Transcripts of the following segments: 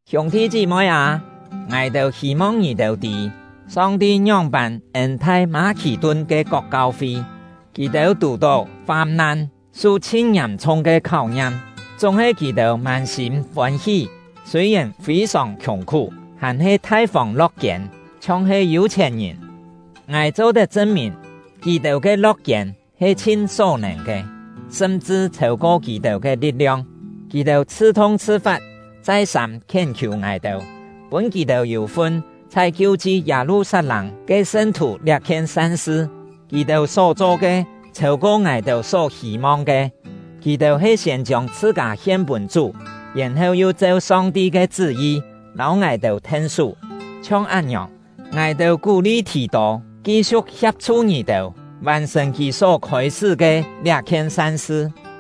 Hiûng-thi chí-moi â, ngài-têu hî-mong ngì-têu tî, Song-ti ngióng-pân ên-thai Mâ-khì-tun ke kok kau-fi. Kì-têu tù-tó fam-nan, su chhin ngiàm-chhung ke kháu-ngiam; chúng-he kì-têu mân-sîm fôn-hí, sûi-yèn fî-sòng khiùng-khú, hàn-he thai-fông lo̍k-kiên, chhiong-he yû-chhièn-ngìn. Ngài cho-tet chṳn-mìn, kì-têu ke lo̍k-kiên he chhin só-nèn ke, sṳm-chṳ chhêu-ko kì-têu ke li̍t-liong. Kì-têu chhṳ-thung chhṳ-fat, chai-sâm khién-khiù ngài-têu, pûn kì-têu yû-fun chhai kiu-chi Yâ-lu-sat-lâng ke sṳn-thù liá-khien san-sṳ. Kì-têu só-cho ke chhêu-ko ngài-têu só hî-mong ke. Kì-têu he siên chiông chhṳ-kâ hien pûn Chú, yèn-heu yu cheu Song-ti ke chṳ́-yi lâu ngài-têu then-sú. Chhiong án-ngiòng, ngài-têu kú-li Thì-tô ki-siu̍k hia̍p-chhu ngì-têu, vàn-sṳ̀n kì só khôi-sṳ́ ke liá-khien san-sṳ.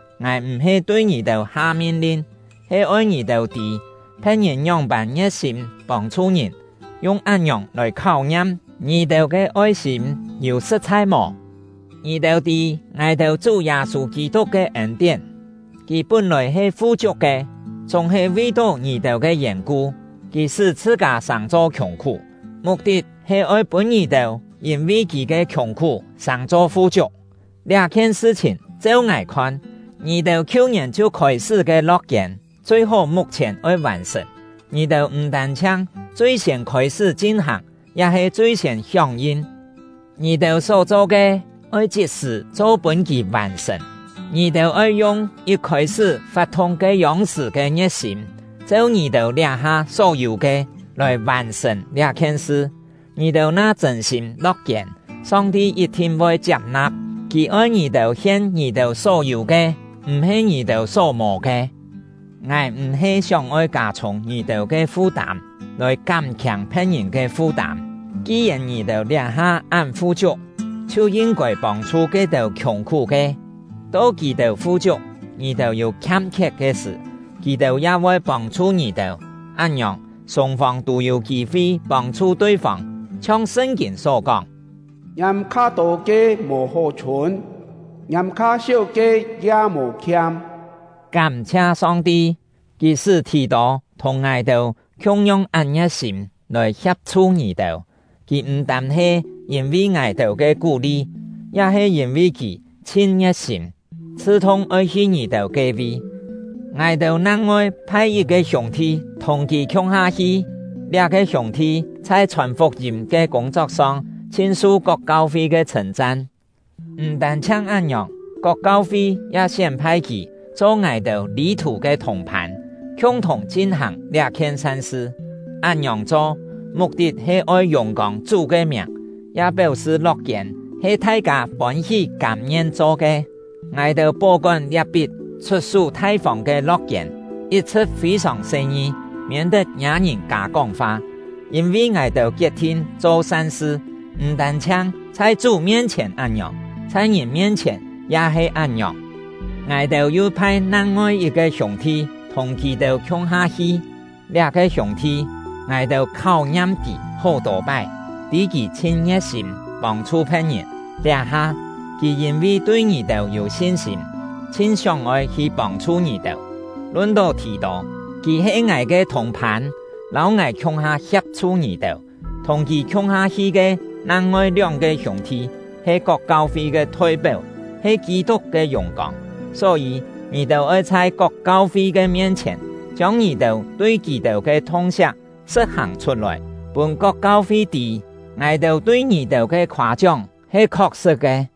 Ngài m̀-he tui ngì-têu ha min-lin, he oi ngì-têu tî phe̍t-ngìn ngióng-pân ngie̍t-sîm pông-chhu ngìn, yung án-ngiòng lòi kháu-ngiam ngì-têu ke oi-sîm yû sṳ̍t-chhai mò. Ngì-têu tî ngài-têu Chú Yâ-sû Kî-tuk ke ên-tién: Kì pún-lòi he fu-chiuk ke, chúng-he vi-tó ngì-têu ke yèn-ku, kì sṳ́ chhṳ-kâ sàng-cho khiùng-khú, muk-tit he oi pûn ngì-têu yîn-vi kì ke khiùng-khú sàng-cho fu-chiuk. Liá-khien sṳ-chhìn, cheu ngài khon: Ngì-têu khiu-ngièn chhiu khôi-sṳ́ ke lo̍k-kiên, chui-hó muk-chhièn oi vàn-sṳ̀n. Ngì-têu m̀ tân-chhiang chui-siên khôi-sṳ́ chin-hàng, ya he chui-siên hióng-yin. Ngì-têu só-cho ke, oi chit-sṳ̀ cho pûn kì vàn-sṳ̀n! Ngì-têu oi yung yit khôi-sṳ́ fat-thung ke-yông-sṳ̀ ke ngie̍t-sîm, cheu ngì-têu liá-ha só yû ke, lòi vàn-sṳ̀n liá-khien sṳ. Ngì-têu na chṳ̂n-sîm lo̍k-kiên, Song-ti yit-thin voi chiap-na̍p; Kì oi ngì-têu hien ngì-têu só yû ke, m̀-he ngì-têu só mò ke. Ngài m̀-he sióng-oi kâ-chhûng ngì-têu ke fu-tâm, lòi kám-khiâng phe̍t-ngìn ke fu-tâm. Ki-yèn ngì-têu liá-ha án fu-chiuk, chhiu yin-kôi pông-chhu ke-têu khiùng-khú ke. To kì-têu fu-chiuk, ngì-têu yû khiam-khiet ke sṳ̀, kì-têu ya voi pông-chhu ngì-têu. Án-ngiòng, sûng-fông tû yû kî-fi pông-chhu tui-fông. Chhiong Sṳn-kîn só kóng: Ngiâm kha-tô ke mò hó-chhûn, ngiâm kha-séu ke ya mò khiam. Kám-chhia Song-ti, Kì sṳ́ Thì-tô thùng ngài-têu khiung-yong án ngie̍t-sîm lòi hia̍p-chhu ngì-têu! Kì m̀-tân he yîn-vi ngài-têu ke kú-li, ya he yîn-vi kì chhin ngie̍t-sîm, chhṳ-thung oi hi ngì-têu ke-vi. Ngài-têu nang-ngoi phai yit-ke hiûng-thi thùng kì khiung-ha hi; liá-ke hiûng-thi chhai chhòn fuk-yîm ke kûng-chok-song chhin su kok kau-fi ke chhṳ̂n-chan. M̀ tân-chhiang án-ngiòng, kok kau-fi ya sién-phai kì cho ngài-têu lî-thù ke thùng-phân, khiung-thùng chin-hàng liá-khien san-sṳ; án-ngiòng cho ke muk-tit he oi yùng-kông Chú ke miàng, ya péu-sṳ lo̍k-kiên he thai-kâ fôn-hí kâm-ngien cho ke. Ngài-têu pó-kón liá-pit chhut-sú thai-fông ke lo̍k-kiên, yit-chhṳ̍t fî-sòng se-ngi, miên-tet ngiâ ngìn kâ kóng-fa; yîn-vi ngài-têu kiet-thin cho san-sṳ, m̀ tân-chhiang chhai Chú mien-chhièn án-ngiòng, chhai ngìn mien-chhièn ya he án-ngiòng. Ngài-têu yu phai nang-ngoi yit-ke hiûng-thi thùng kì-têu khiung-ha hi. Liá-ke hiûng-thi, ngài-têu kháu-ngiam kì hó-tô pái, tî kì chhin ngie̍t-sîm pông-chhu phe̍t-ngìn. Liá-ha, kì yîn-vi tui ngì-têu yû sin-sîm, chhin sióng-oi hi pông-chhu ngì-têu. Lun-tó Thì-tô, kì he ngài ke thùng-phân, lâu ngài khiung-ha hia̍p-chhu ngì-têu. Thùng kì khiung-ha hi ke nang-ngoi lióng-ke hiûng-thi he kok kau-fi ke thoi-péu, he Kî-tuk ke yùng-kông. Só-yî, ngì-têu oi chhai kok kau-fi ke mien-chhièn, chiông ngì-têu tui kì-têu ke thung-siak sṳ̍t-hàng chhut-lòi, pûn kok kau-fi tî, ngài-têu tui ngì-têu ke khoâ-chióng he khok-sṳ̍t ke.